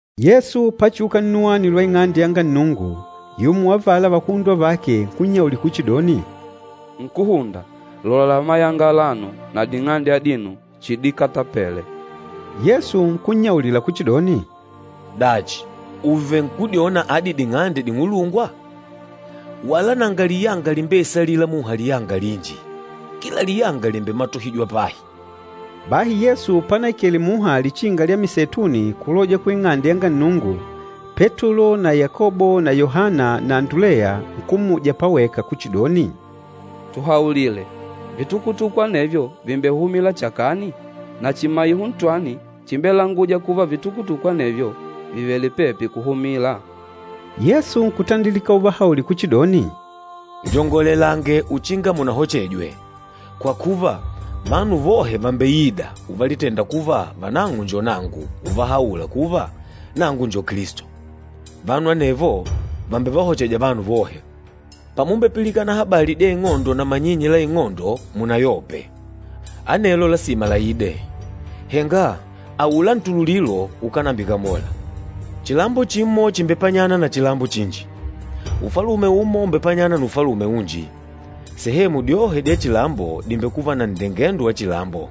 Yesu pachiuka nnuwani lwa Ing'ande yanga Nnungu, yumo wa avala vakuhundwa vake nkunnyaulila kuchidoni, “Nkúhunda, lola mayanga alano na ding'ande adino chidikatapele!” Yesu nkunnyaulila kuchidoni, “Dachi, ùvenkudyona adi ding'ande ding'ulungwa? Wala nanga liyanga limbeisalîla muha liyanga linji, kila liyanga lìmbematohijwa pahi.” Bahi Yesu panaikela muha Lichinga lya Miseituni kuloja ku Ing'ande yanga Nnungu, Petulo na Yakobo na Yohana na Anduleya nkummuja paweka kuchidoni, “Tuhaulile, vitukutuku anevyo vìmbehumila chakani? Na chimaiho ntwani chimbelangûja kuva vitukutuku anevyo vìvele pepi kuhumila?” Yesu nkutandilika uvahaulila kuchidoni, “Lyongolelange uchinga munahochejwe. Kwa kuva, vanu vohe vàmbeida uvalitenda kuva vanang'o njo nangu, uvahaula kuva, ‘Nangu njo Kilisto.’ Vanu anevo vàmbevahocheja vanu vohe. Pàmumbepilikana habali dya ing'ondo na manyinyi la ing'ondo, henga munayope. Anelo lasima laide, henga aula ntululilo ukánambikamola. Chilambo chimo chìmbepanyana na chilambo chinji, ufalume umo ùmbepanyana na ufalume unji. Sehemu dyohe dya chilambo dìmbekuva na nndengendo wa chilambo,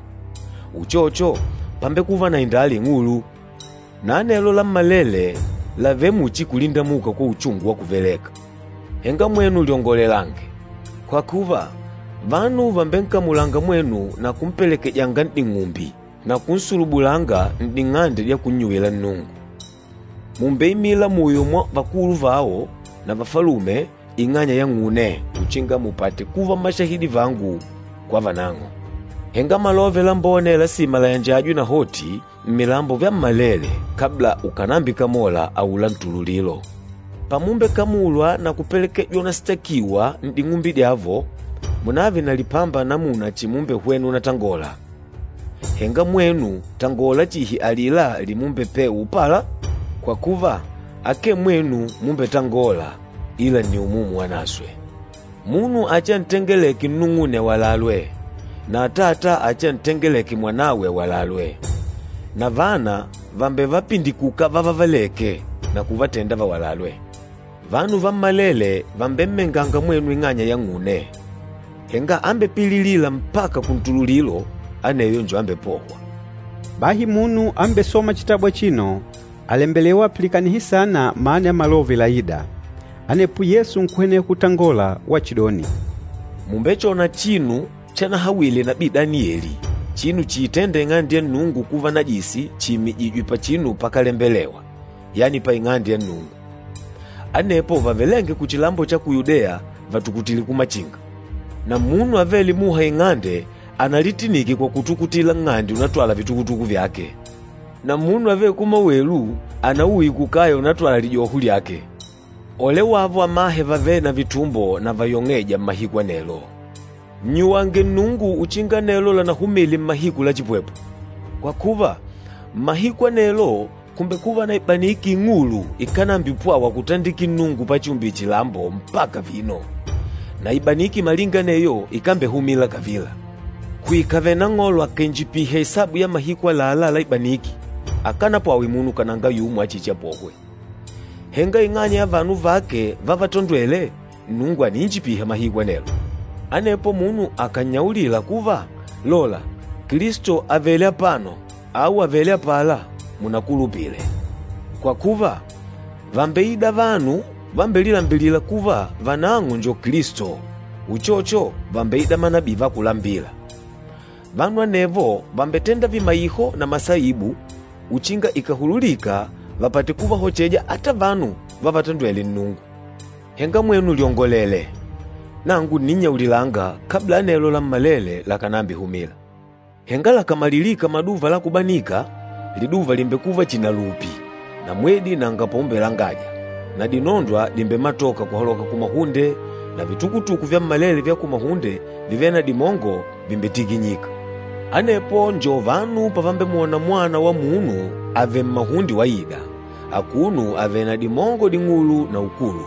uchocho pàmbekuva na indala ing'ulu. Na anelo lammalele làvele muchi kulindamuka kwa uchungu wa kuveleka. Henga mwenu lyongolelange. Kwa kuva, vanu vàmbenkamulanga mwenu na kumpelekejanga n'ding'umbi, na kunsulubulanga n'ding'ande dya kunnyuwila Nnungu. Mùmbeimila muyo mwa vakulu vao na vafalume ing'anya yang'une uchinga mupate kuva mmashahidi vangu kwa vanang'o. Henga Malove Lambone lasima layanjajwe nahoti mmilambo vyammalele kabla ukànambikamola aula ntululilo. Pamumbekamulwa na kupelekejwa unasitakiwa n'ding'umbi dyavo, munave na lipamba namuna chimumbehwena unatangola. Henga mwenu tangola chihi alila limumbepewa upala, kwa kuva, akee mwenu mumbetangôla, ila nni Umumu Wanaswe. Munu achiantengeleke nnung'une awalalwe, na atata achiantengeleke mwanawe awalalwe. Na vana vàmbevapindikuka vávavelèkè na kuvatenda vawalalwe. Vanu vammalele vàmbemmenganga mwenu ing'anya yang'une. Henga ambepililîla mpaka kuntululilo aneyo njo ambepôhwa.” Bahi munu ambesôma chitabu achino, àlembelewa apilikanihe saana mana ya malove laîda. Anepo Yesu nkuhweneha kutangola wachidoni, “Mùmbechona chinu chanahawile nabii Danieli, chinu chiitênda Ing'ande ya Nnungu kuva najisi chiimijìjwè pachinu pakálembelewa, yani pa Ing'ande ya Nnungu. Anepo vavelênge kuchilambo cha ku Yudeya vatukutile kumachinga. Na munu avêle muha ing'ande analitinike kwa kutukutila nng'ande unatwala vitukutuku vyake. Na munu avêle kumawelu anauye kukaya unatwala lijoho lyake. Ole wavo amahe vavêle na vitumbo na vayong'êja mmahiku anelo! Nnyuwange Nnungu uchinga anelo lànahumile mmahiku la chipwepwe. Kwa kuva, mmahiku anelo kùmbekuva na ibaniki ing'ulu ikánambipwawa kutandikila Nnungu pachiumbile chilambo mpaka vino, na ibaniki malinga aneyo ikámbehumila kavila. Kuikave Nang'olo akàinjipiha isabu ya mahiku àlalá la ibaniki, akánapwawe munu kananga yumo achichiapohwe. Henga ing'anya ya vanu vake vávatondwèlè, Nnungu àniinjipiha mahiku anelo. Anepo munu akànnyaulila kuva, ‘Lola, Kilisto àvele apano,’ au ‘Àvele apala,’ munakulupile. Kwa kuva, vàmbeida vanu vambelilambilîla kuva vanang'o njo Kilisto, uchocho vàmbeida manabii va kulambila. Vanu anevo vàmbetenda vimaiho na masaibu, uchinga ikàhululika vapate kuvahocheja ata vanu vávatondwèlè Nnungu. Henga mwenu lyongolele. Nangu ǹninnyaulilanga kabla anelo lammalele lakànambihumila. Henga lakàmalilika maduva la kubanika, liduva lìmbekuva chihi na lupi na mwedi nanga paumbelangaja na dinondwa dimbematoka kuhaloka kumahunde na vitukutuku vyammalele vya kumahunde vivêle na dimongo, vìmbetikinyika. Anepo njo vanu pavambemwona Mwana wa Munu avèlè mmahunde waida, akuno avèlè na dimongo ding'ulu na ukulu.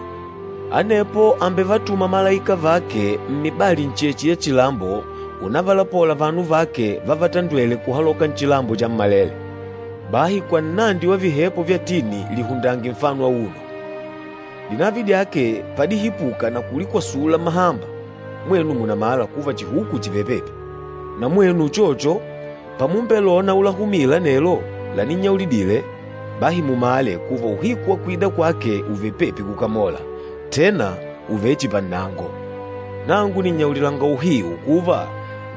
Anepo àmbevatuma malaika vake mmibali ncheche ya chilambo unavalapola vanu vake vávatandwèlè kuhaloka nchilambo chammalele. Bahi kwa nnandi wa vihepo vya tini lihundange nfano auno. Dinavi dyake padihipuka na kulikwasula mahamba, mwenu mùnamala kuva chihuku chìvele pepi. Na mwenu uchocho, pamumbelona ulahumila anelo laninnyaulidile, bahi mumale kuva uhiku wa kwida kwake ùvele pepi kukamola, tena ùvele chihi pannango. Nangu nìnnyaulilanga uhiu kuva,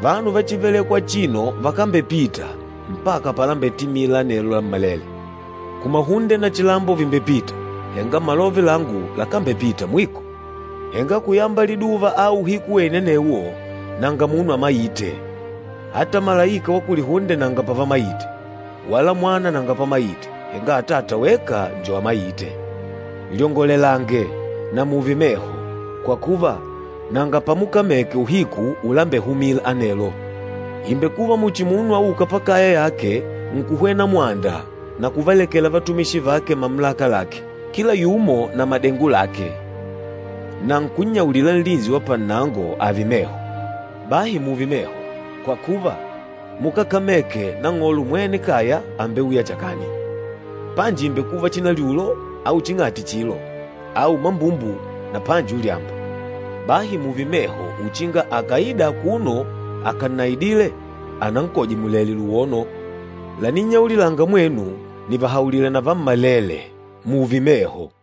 vanu va chívelèkwà achino vakambepita, mpaka palambetimila anelo lammalele. Kumahunde na chilambo vìmbepita, henga malove langu lakambepita mwiko.” “Henga kuyamba liduva au uhiku wene anewo, nanga munu amaîte, ata malaika va kulihunde nanga pavamaite, wala Mwana nanga pamaite, henga Atata weka njo amaîte. Lyongolelange, na muve meho, kwa kuva, nanga pamukameke uhiku ulambehumila anelo. Ìmbekuva muchi munu aûka pakaya yake nkuhwena mwanda na kuvalekela vatumishi vake mamulaka lake, kila yumo na madengo lake, na nkunnyaulila nlinsi wa pannango ààve meho. Bahi mùùve meho, kwa kuva, mukákameke nang'olo mwene kaya àmbeuya chakani, panji ìmbekuva chinalyulo, au ching'ati chilo, au mambumbu na panji ulyamba. Bahi mùùve meho uchinga akàida akuno akannaidìlè anankoje mulèlè luwono. Laninnyaulilanga mwenu, nìvahaulila na vammalele, mùùve meho!”